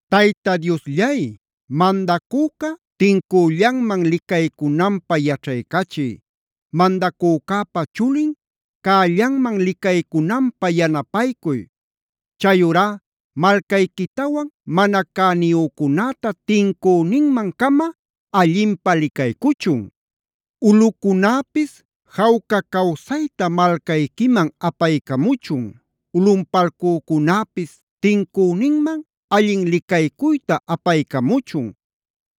Tayta Diosllay, mandacüca tincüllanman licaycunanpä yaćhaycachiy. Mandacücäpa chulin cällanman licaycunanpä yanapaycuy. Chayurá malcayquitawan mana cäniyücunäta tincüninman-cama allinpä licaycuchun. Ulꞌucunäpis jawca cawsayta malcayquiman apaycamuchun. Ulꞌunpalcücunäpisa tincüninman allin licaycuyta apaycamuchun.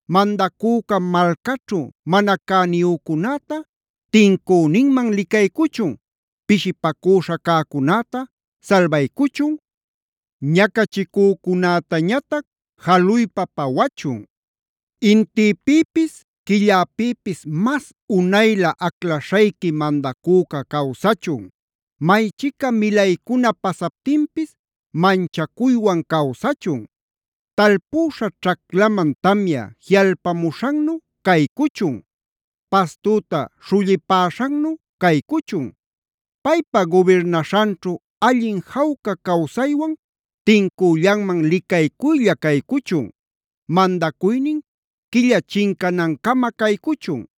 Mandacüca malcaćhu mana cäniyücunäta tincüninman licaycuchun, pishipacüśha cäcunäta salbaycuchun, ñacachicücunätañatac jaluypa pawachun. Intïpïpis quilläpïpis mas unaylä aclaśhayqui mandacüca cawsachun. Maychica milaycuna pasaptinpis manchacuywan cawsachun. Talpüśha ćhaclaman tamya jiꞌalpamuśhannu caycuchun. Pastüta śhullipäśhannu caycuchun. Paypa gubirnaśhanćhu allin jawca cawsaywan tincüllanman licaycuylla caycuchun. Mandacuynin quilla chincanancama caycuchun.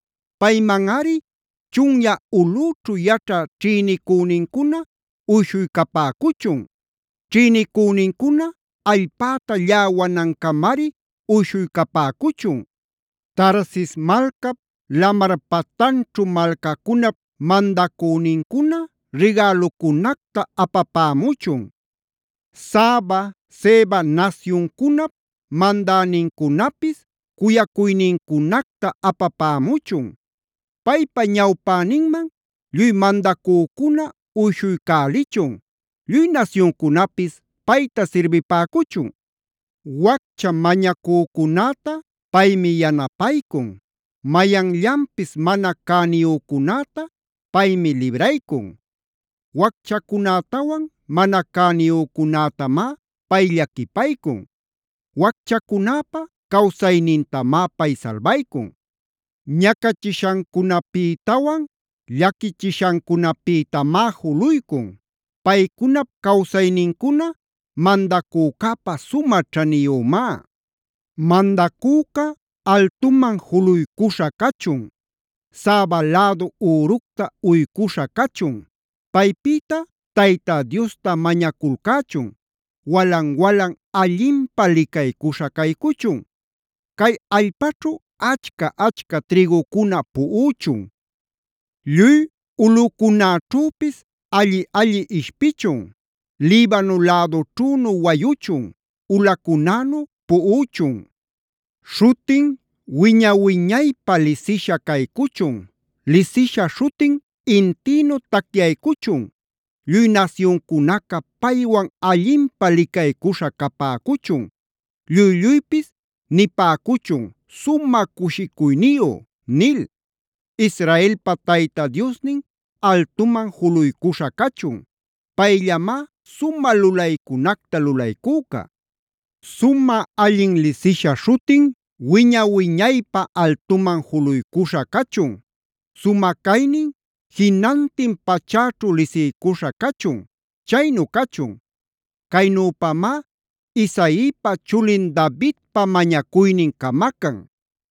Paymanꞌari chunyä ulꞌüćhu yaćhä ćhïnicünincuna uyshuycapäcuchun. Ćhïnicünincuna allpäta lläwanancamari uyshuycapäcuchun. Tarsis malcap, lamar patanćhu malcacunap Mandacünincuna rigälucunacta apapämuchun. Saba, Seba nasyuncunap mandänincunapis cuyacuynincunacta apapämuchun. Paypa ñawpäninman lluy mandacücuna uyshuycälichun. Lluy nasyuncunapis payta sirbipäcuchun. Waccha mañacücunäta paymi yanapaycun. Mayanllanpis mana cäniyücunäta paymi libraycun. Wacchacunätawan mana cäniyücunätamá pay llaquipaycun. Wacchacunäpa cawsaynintamá pay salbaycun. Ñacachishancunapïtawan llaquichishancunapïtamá juluycun. Paycunap cawsaynincuna mandacücäpä sumä ćhaniyümá. Mandacüca altuman juluycuśha cachun. Saba lädu üructa uycuśha cachun. Paypïta Tayta Diosta mañaculcächun. Walan-walan allinpä licaycuśha caycuchun. Cay allpaćhu achca-achca trïgucuna puꞌuchun. Lluy ulꞌucunäćhüpis alli-alli ishpichun. Libano lädućhünu wayuchun; ulacunänu puꞌuchun. Śhutin, wiña-wiñaypä lisisha caycuchun. Lisisha śhutin intïnu tacyaycuchun. Lluy nasyuncunaca paywan allinpä licaycuśha capäcuchun. Lluy-lluypis nipäcuchun: “Sumä cushicuyniyu” nil. Israelpa Tayta Diosnin altuman juluycuśha cachun. Payllamá sumä lulaycunacta lulaycüca. Sumä allin lisisha śhutin wiña-wiñaypä altuman juluycuśha cachun. Sumä caynin jinantin pachäćhu lisiycuśha cachun. Chaynu cachun. Caynüpamá Isaipa chulin Davidpa mañacuynin camacan.